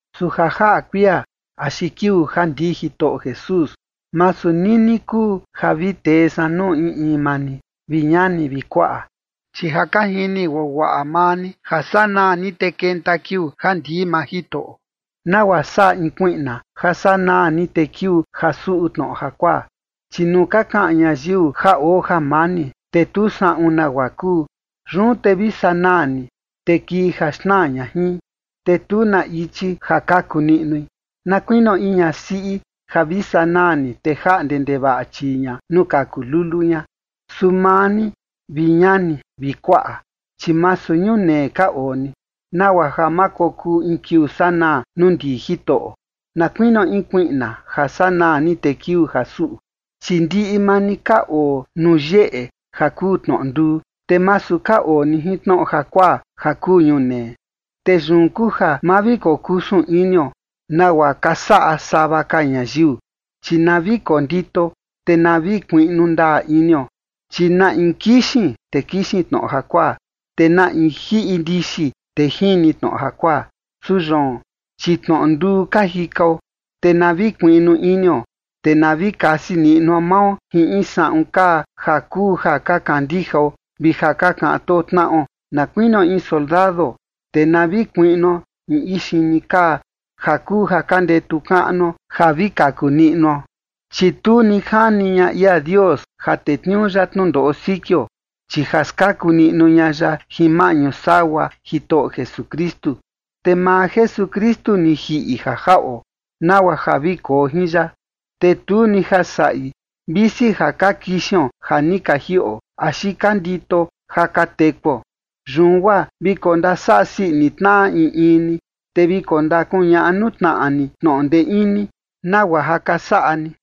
Su ja jaꞌa kuia axi kiuu ja ndii Jitoꞌo Jesús, masu nini kuu ja vi tee san nuu in in maa ni, vi ñani vi kuaꞌa. Chi ja ka jini guaguaꞌa maa ni ja sanaa ni, te kenta kiuu ja ndii maa Jitoꞌo, nagua saꞌa in kuiꞌna ja sanaa ni, te kiuu ja suꞌu tnoꞌo jakuaa. Chi nuu ka kaꞌan ñayiu ja oo jamani, te tu saꞌun nagua kuu, yun te vi sanaa ni, te kii ja xnaa ña jin, te tu na ichi ja kaku niꞌnui, na kuinio in ñasiꞌi ja vi sanaa ni, te jaꞌnde ndevaꞌa chii ña nuu kaku lulu ña. Su maa ni, vi ñani vi kuaꞌa, chi masu ñunee ka oo ni, nagua ja ma kokuu in kiuu sanaa nuu ndii Jitoꞌo, na kuinio in kuiꞌna ja sanaa ni, te kiuu ja suꞌu. Chi ndiꞌi maa ni ka oo nuu yeꞌe, ja kuu tnoꞌo nduu, te masu ka oo ni jin tnoꞌo jakuaa ja kuu ñunee. Te yun kuu ja ma vi kokusun inio nagua ka saꞌa sava ka ñayiu, chi na vi kondito, te na vi kuiꞌnu ndaa inio, chi na in kixin, te kixin tnoꞌo jakuaa, te na in jiꞌi ndixi, te jini tnoꞌo jakuaa. Su yoon, chi tnoꞌo nduu ka jikao, te na vi kuiꞌnu inio, te na vi kasi niꞌnuo mao jin in saꞌun kaa ja kuu ja ka kandijao vi ja ka kaꞌan too tnaꞌo, na kuinio in soldado, te na vi kuiꞌnuo in ixini kaa ja kuu ja ka ndetu kaꞌnuo ja vi kaku niꞌnuo. Chi tu ni jani ña ia Dios ja tetniuu ya tnundoꞌo sikio, chi ja skaku niꞌnu ña ya jin maꞌñu sagua Jitoꞌo Jesukristu. Te maa Jesukristu ni jiꞌi ja jaꞌo nagua ja vi koo jin ya, te tu ni ja saꞌi, visi ja ka kixion ja ni ka jiꞌo axi ka ndito ja ka tekuo. Yun guaa vi kondasaꞌa sii ini tnaꞌa in in ni, te vi kondakuñaꞌa nuu tnaꞌa ni tnoꞌo ndee ini, nagua ja ka saꞌa ni.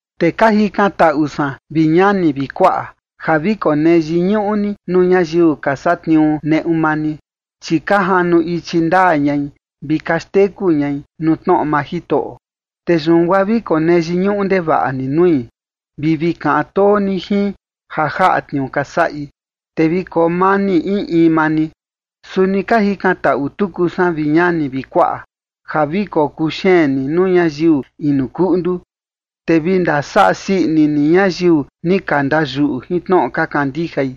Te ka jikantaꞌu san, vi ñani vi kuaꞌa, ja vi konee yiñuꞌu ni nuu ñayiu ka satniuu neꞌu maa ni, chi ka janu ichi ndaa ñai vi ka xteku ñai nuu tnoꞌo maa Jitoꞌo. Te yun guaa vi konee yiñuꞌu ndevaꞌa ni nui vi vi kaꞌan too ni jin ja jaꞌa tniuu ka saꞌi. Te vi koo mani in in maa ni. Suni ka jikantaꞌu tuku san, vi ñani vi kuaꞌa, ja vi kokuu xeen ni nuu ñayiu inu kuꞌndu, te vi ndasaꞌa sii ini ni ñayiu ni ka ndayuꞌu jin tnoꞌo ka kandijai,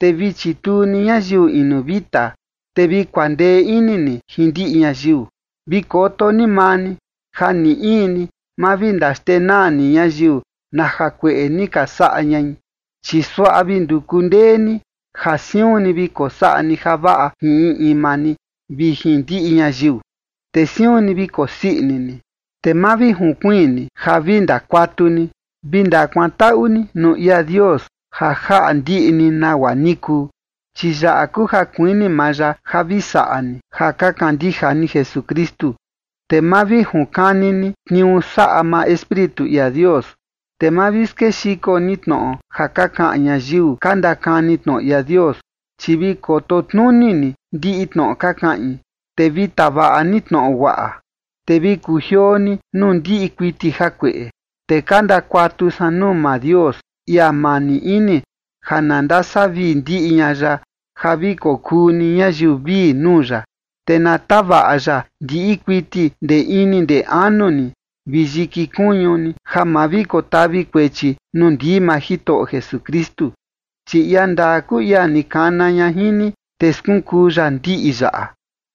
te vi chituu ni ñayiu inu vita, te vi kuandee ini ni jin ndiꞌi ñayiu. Vi koto ni maa ni ja ni in ni ma vi ndaxndenaa ni ñayiu na jakueꞌe ni ka saꞌa ñai, chi suaꞌa vi nduku ndee ni ja siun ni vi kosaꞌa ni javaꞌa jin in in maa ni vi jin ndiꞌi ñayiu. Te siun ni vi kosii ini ni. Te ma vi junkuiin ni ja vi ndakuatu ni. Vi ndakuantaꞌu ni nuu ia Dios ja jaꞌa ndiꞌi ni nagua ni kuu. Chi yaꞌa kuu ja kuini maa ya ja vi saꞌa ni ja ka kandija ni Jesukristu. Te ma vi junkani ni tniuu saꞌa maa Espíritu ia Dios. Te ma vi skexiko ni tnoꞌo ja ka kaꞌan ñayiu ka ndakani tnoꞌo ia Dios. Chi vi koto tnuni ni ndiꞌi tnoꞌo ka kaꞌin, te vi tavaꞌa ni tnoꞌo guaꞌa. Te vi kujioo ni nuu ndiꞌi kuiti jakueꞌe. Te ka ndakuatu san nuu maa Dios, ia mani ini, ja na ndasavii ndiꞌi ña ya, ja vi kokuu ni ñayiu vii nuu ya, te na tavaꞌa ya ndiꞌi kuiti ndee ini ndee anu ni vi yiki kuñu ni, ja ma vi kotavi kuechi nuu ndii maa Jitoꞌo Jesukristu. Chi ia ndaa kuu ia ni kana ña jin ni, te skunkuu ya ndiꞌi yaꞌa.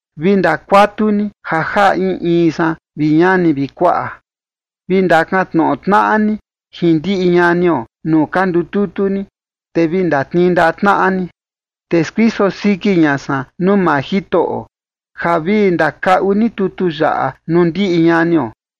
Vi ndakuatu ni ja jaꞌa in in san, vi ñani vi kuaꞌa. Vi ndakaꞌan tnoꞌo tnaꞌa ni jin ndiꞌi ñanio nuu ka ndututu ni, te vi ndatnii ndaꞌa tnaꞌa ni. Te skuiso siki ña san nuu maa Jitoꞌo ja vi ndakaꞌu ni tutu yaꞌa nuu ndiꞌi ñanio.